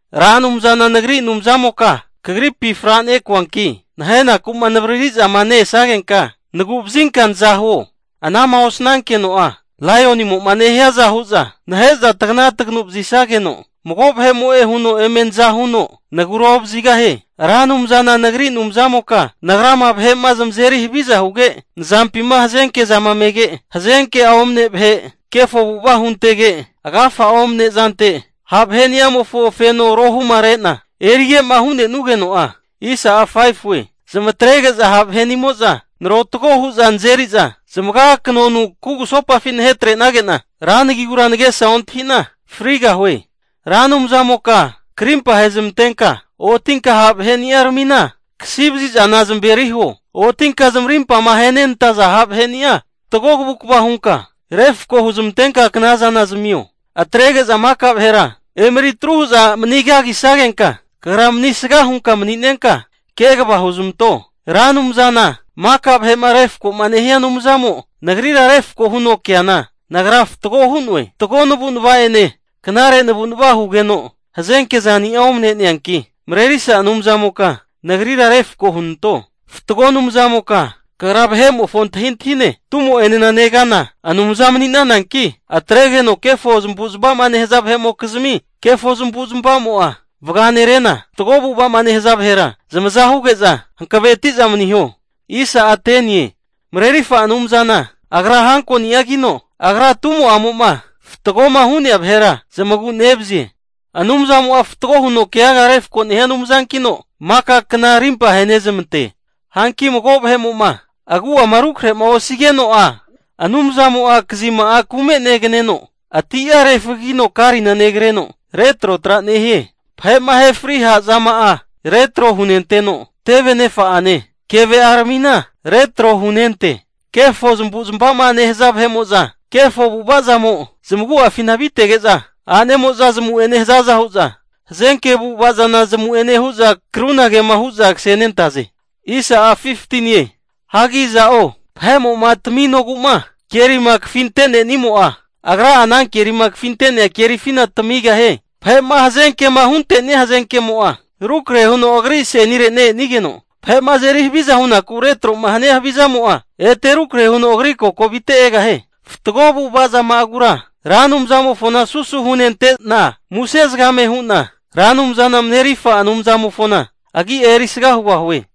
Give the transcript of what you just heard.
Ra Anumzana nagri Anumzamoka, kagripi fra nekuanki, nahenaku'ma navrarizama ne-esagenka nagu'vazinka naza huo. Ana'ma osnankeno'a laionimo'ma nehiaza hu'za nahe'za tagna taganu vazisageno mago vahe'mo'e huno eme naza huno nagura ovazigahie. Ra Anumzana nagri Anumzamoka, nagrama vahe'ma zamazeri haviza huge, nzampima hazenke'zama mege, hazenke'a omne vahe kefo avu'ava huntege, agafa'a omne zante ha' vahe'ni'amofo feno rohumare'na erige'ma hu'nenuana geno'a, zamatrege'za ha' vahe'nimo'za narotgo hu'za nazeri'za zamaga kanonu kugusopafi nahetrenage'na ra nagigura nagesa ontahi'na frineno. Ra Anumzamoka krimpa hezmantenka otinka, ha' vahe'niaramina kasi vazizana eri zamaveri huo. Otinka zamarimpama ahenenantaza ha' vaheni'a fatgo kavukva hunka refko huzmantenka knazana zamio. Atrege'za maka vahera emeri atru hu'za manigagisagenka, kagra manisga hunka mani'nenka kegava huzmanto. Ra Anumzana maka vahe'ma refko nehia Anumzamo nagrira refko huno keana, nagra fatgo hu'noe. Fatgo navu'nava'ene knare navu'nava hugeno, hazenke zani'a omane'neanki, marerisa Anumzamoka nagrira refko hunanto. Fatgo Anumzamoka kagra vahe'mofo antahintahine, tumo'enena negana Anumza mani'nananki, atregeno kefo zamavu'zmavama nehaza vahe'mokizmi kefo zamavu'zmava'mo'a vaganerena, fatgo avu'ava'ma nehaza vahera zamaza huge'za hankaveti'za maniho. Marerifa Anumzana agra hankoni'agino, agra tumo'amo'ma fatgoma hu'nea vahera zamagu'nevazie. Anumzamo'a fatgo huno keaga refko nehia Anumzankino, maka kna arimpa ahenezmante. Hanki mago vahe'mo'ma agu'ama rukrahe osigeno'a, Anumzamo'a kazima'a kume neganeno, ati'a refagigino karina negreno retrotrara nehie. Vahe'ma ahe fri ha' zama'a retro hunenteno, teve nefa'ane kevea'aramina retro hunente. Kefo zamavu'zmava'zama nehaza vahe'mo'za kefo avu'ava zamo zamagu'afina avitege'za, a'nemo'za zamu'ene hazaza hu'za hazenke avu'ava zana zamu'ene hu'za krunagema hu'za kasenentaze. Hagi iza'o vahe'moma taminogu'ma kerima kafintenimo'a, agra'a ana kerima kafintenia kerifi tamigahie. Vahe'ma hazenkema hunte'nia hazenkemo'a rukrahe huno agri asenire ne-enigeno, vahe'ma azeri haviza hunaku retro'ma hania havizamo'a ete rukrahe huno agri kokovite egahie. Fatgo avu'ava zama'agura Ra Anumzamofona susu hunente'na, muse zagame hu'na Ra Anumzana Marerifa Anumzamofona agia erisga hugahue.